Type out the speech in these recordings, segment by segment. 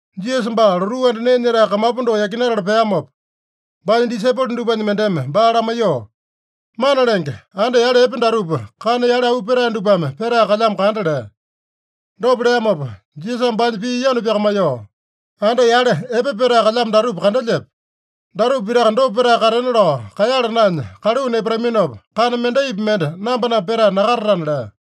Jisasa baa lotuu anda nee nyetae kamapu doko yakinatala peamopa, baanya disaipolo dupanya mendeme baa lamaiyoo, “Mana Lenge, anda yale epe datupa kana yale auu petae dupame petae kalyamo kanda” lea. Dopa leamopa Jisasame baanya pii yanu pyakamaiyoo, “Anda yale epe petae kalyamo datupa kandelyepe? Datupa pitaka dopa petae katena lao kaeyala naenya kaluu nepataminopa, kana mendaipi mende namba-namba petae nakatatana” lea.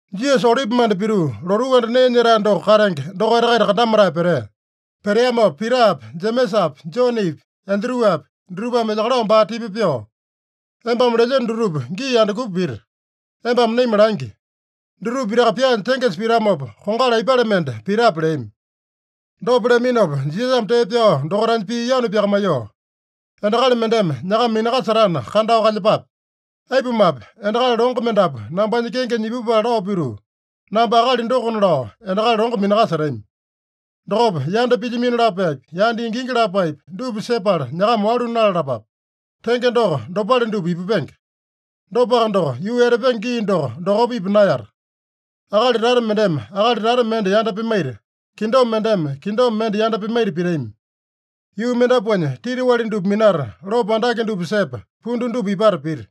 Jisasa Olipimanda pituu, lotuu anda nee nyetae doko katenge dokaita-kaita kandamatae petea. Peteamopa Pitapi, Jemesapi, Jonepi, Andruapi dutupame elyakalao baa tipa pyoo, “Embame lelyeno dutupa gii andukupa pita? Embame naima langi. Dutupa pitaka pyaanya tengesa pitamopa, kongali aipale mende pitape?” leami. Dopa leaminopa Jisasame tee pyao dokaitanya pii yanu pyakamaiyoo, “Endakali mendeme nyakama minakasetana, kandao kalyepape. Aipumape, endakali longo mendapu nambanya kengenya ipupala lao pituu, ‘Namba akali dokona’ lao endakali longo minakasetami. Dokopa yanda pilyamino lapaepi, yanda ingingi lapaepi, dupa sepala nyakama walu nalalapape. Tenge doko, dopale dupa ipupenge. Dopaka doko, yuu etapenge gii doko, dokopa ipa naeyata. Akali tata mendeme akali tata mende yanda pimaita, kingdom mendeme kingdom mende yanda pimaita pitami. Yuu mendapuanya titiwali dupa minata, lopo andake dupa sepa, pundu dupa ipata pita.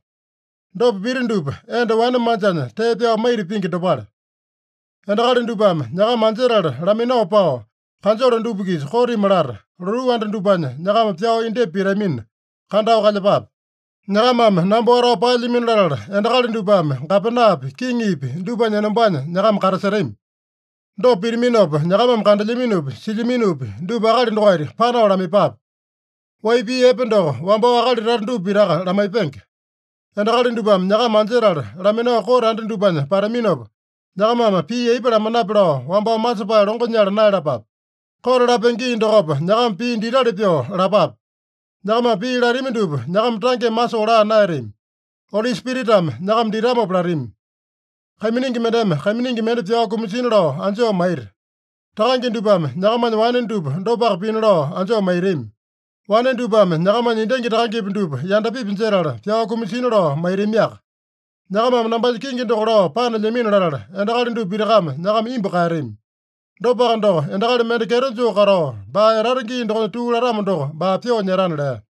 Dopa pita dupa, enda wane manjanya tee pyao maita pingi dopale. “Endakali dupame nyakama anjetala laminao pao, kanjole dupa-kisa kotimi lata, lotuu anda dupanya nyakama pyao indyepa pitamina, kandao kalyepape. Nyakamame namba watao paelyamino latala, endakali dupame gapenapi, kiŋipi dupanya enombanya nyakama katasetami. Dopa pitaminopa, nyakamame kandelyaminopi, silyaminopi dupa akali dokaita panao lamaiyepape. Wai pii epe doko wambao akali tata dupa pitaka lamaipenge. Endakali dupame nyakama anjetala laminao kote anda dupanya pataminopa, nyakamame pii aipa lamanape lao wambao masepae longo nyala naeyalapape. Kote lapenge gii dokopa nyakama pii ditali pyoo lapape. Nyakamame pii latami dupa, nyakama tangeme masoo laa naeyatami. Oli Spiritame nyakama ditamopa latami. Kaiminingi mendeme kaiminingi mende pyao kumasina lao anjoo maita. Takange dupame nyakamanya wane dupa dopaka pina lao anjoo maitami. Wane dupame nyakamanya endangi takangepi dupa yandapipi jetala, pyao kumasina lao maitamiaka. Nyakamame nambanya kenge doko lao panelyamino latala, endakali dupa pitakame nyakama imbu kaeyatami. Dopaka doko, endakali mende kyeto joo katao, baa etata gii dokonya tuu latamo doko, baa pyoo nyetana” lea.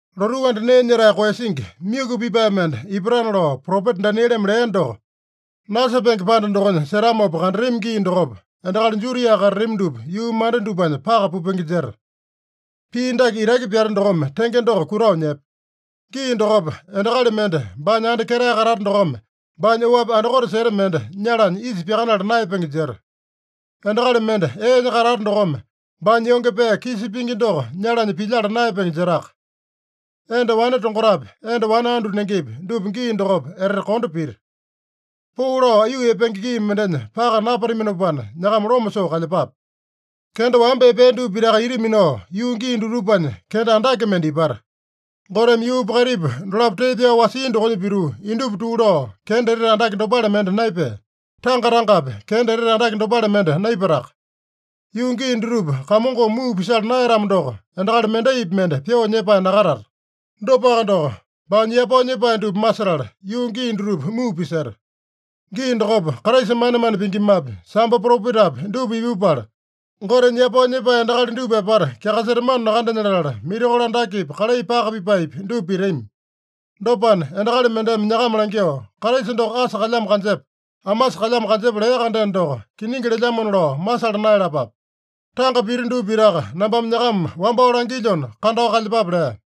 “Lotuu anda nee nyetae koeyasingi, myuku pipae mende ipatana lao propeta Danieleme lea doko, nasepenge panda dokonya setamopa kandatami gii dokopa, endakali Judia katatami dupa yuu manda dupanya paka pupenge jeta.” (Pii dake itaki pyate dokome tenge doko kutao nyepe.) “Gii dokopa endakali mende baanya anda ketae katata dokome, baanya oapi andakote seta mende nyalanya isa pyakanala naeyapenge jeta. Endakali mende eenya katata dokome, baanya yonge pee kisa pingi doko nyalanya pilyala naeyapenge jetaka. Enda wane tongotapi, enda wane andu nengepi, dupa gii dokopa etete kondo pita. Poo lao aiyuu epenge gii mendenya paka napataminopana nyakama loma soo kalyepape. Kenda wamba epea dupa pitaka ita minao, yuu gii dutupanya kenda andake mende ipata. Goteme yuupa kaitipa dolapo tee pyao wasia dokonya pituu, indupa tuu lao, kenda etete andake dopale mende naepea. Tanga-tangapi kenda etete andake dopale mende naipataka. Yuu gii dutupa Kamongome muu pisala naeyatamo doko, endakali mendaipi mende pyoo nyepae nakatata. Dopaka doko, baanya yapao nyepae dupa masetala, yuu gii dutupa muu piseta. Gii dokopa Kraisa manemane pingimapi, sambo propetapi dupa ipupala, Gotenya yapao nyepae endakali dupa apata kyakasetamano nakandenya latala, mirakolo andakepi, kalai paka pipaepi, dupa pitami. Dopana, endakali mendeme nyakama langyoo, ‘Kraisa doko asa kalyamo kanjepa, amasa kalyamo kanjepa’ lea-kandeno doko, kiningi lelyamona lao masala naeyalapape. Tanga pita dupa pitaka nambame nyakama wambao langilyona, kandao kalyepape” lea.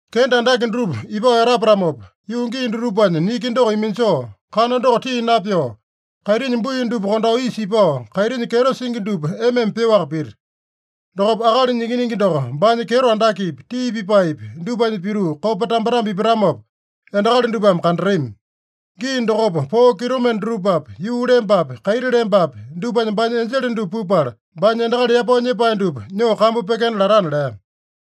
“Kenda andake dutupa ipao etapatamopa, yuu gii dutupanya niki doko iminjoo, kana doko tii napyoo, kaitinya bui dupa kondao isa ipao, kaitinya kyeto singi dupa ema-ema pyoaka pita. Dokopa Akalinya Ikiningi doko baanya kyeto andakepi, tii pipaepi dupanya pituu, kopa tambetambe ipatamopa endakali dupame kandatami. Gii dokopa poo kitomende dutupapi, yuu lembapi, kaiti lembapi, dupanya baanya enjele dupa pupala, baanya endakali yapao nyepae dupa nyoo kambu pyekena latana” lea.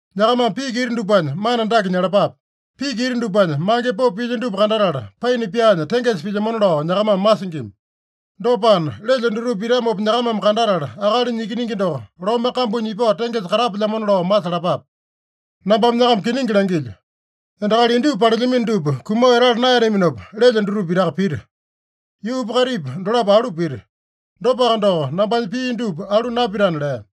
“Nyakamame piki ita dupanya mana dake nyalapape: Piki ita dupanya mange popo pilya dupa kandatala, paina pyaanya tengesa pilyamona lao nyakamame masingima. Dopana, lelyo dutupa pitamopa nyakamame kandatala, Akalinya Ikiningi doko lome kambunya ipao tengesa katapelyamona lao masalapape. Nambame nyakama kiningi langilyo: Endakali indupa palelyamino dupa kumao etala naeyataminopa, lelyo dutupa pitaka pita. Yuupa kaitipa dolapo alu pita. Dopaka doko, nambanya pii dupa alu napitana” lea.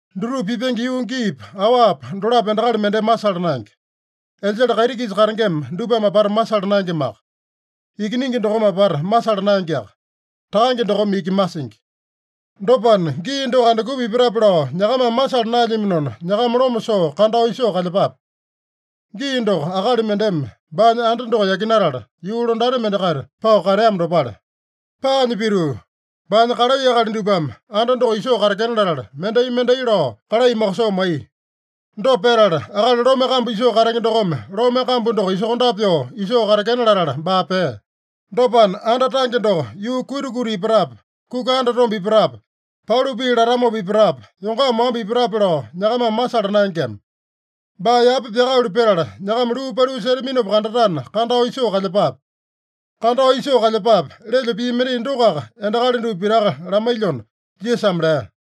“Dutupa pipenge yuu giipa, awapa dolapo endakali mendeme masala naenge. Enjele kaiti-kisa katengema dupame apata masala naengemaka. Ikiningi dokome apata masala naengeaka. Takange dokome iki masingi. Dopana, gii doko andukupa ipatape lao nyakamame masala naelyaminona, nyakama loma soo kandao isoo kalyepape. Gii doko akali mendeme baanya anda doko yakinatala, yuu londati mendakaita pao kateamo dopale. Paanya pituu baanya kalai akali dupame anda doko isoo katekena latala, mendai-mendai lao kalai mokosoo maiya. Dopa petala, akali lome kambu isoo katenge dokome lome kambu doko isokondape pyoo isoo katekena latala, baa pea. Dopana, anda tange doko yuu kuita-kuita ipatape, kuka andatombe ipatape, pauli pii latamopa ipatape, yongama wamba ipatape lao nyakamame masala naengema. Baa yapa pyakaeyalu petala, nyakama luu paliu setaminopa kandatana kandao isoo kalyepape. ‘Kandao isoo kalyepape!’ lelyo pii mendai dokoaka endakali dupa pitaka lamailyona” Jisasame lea.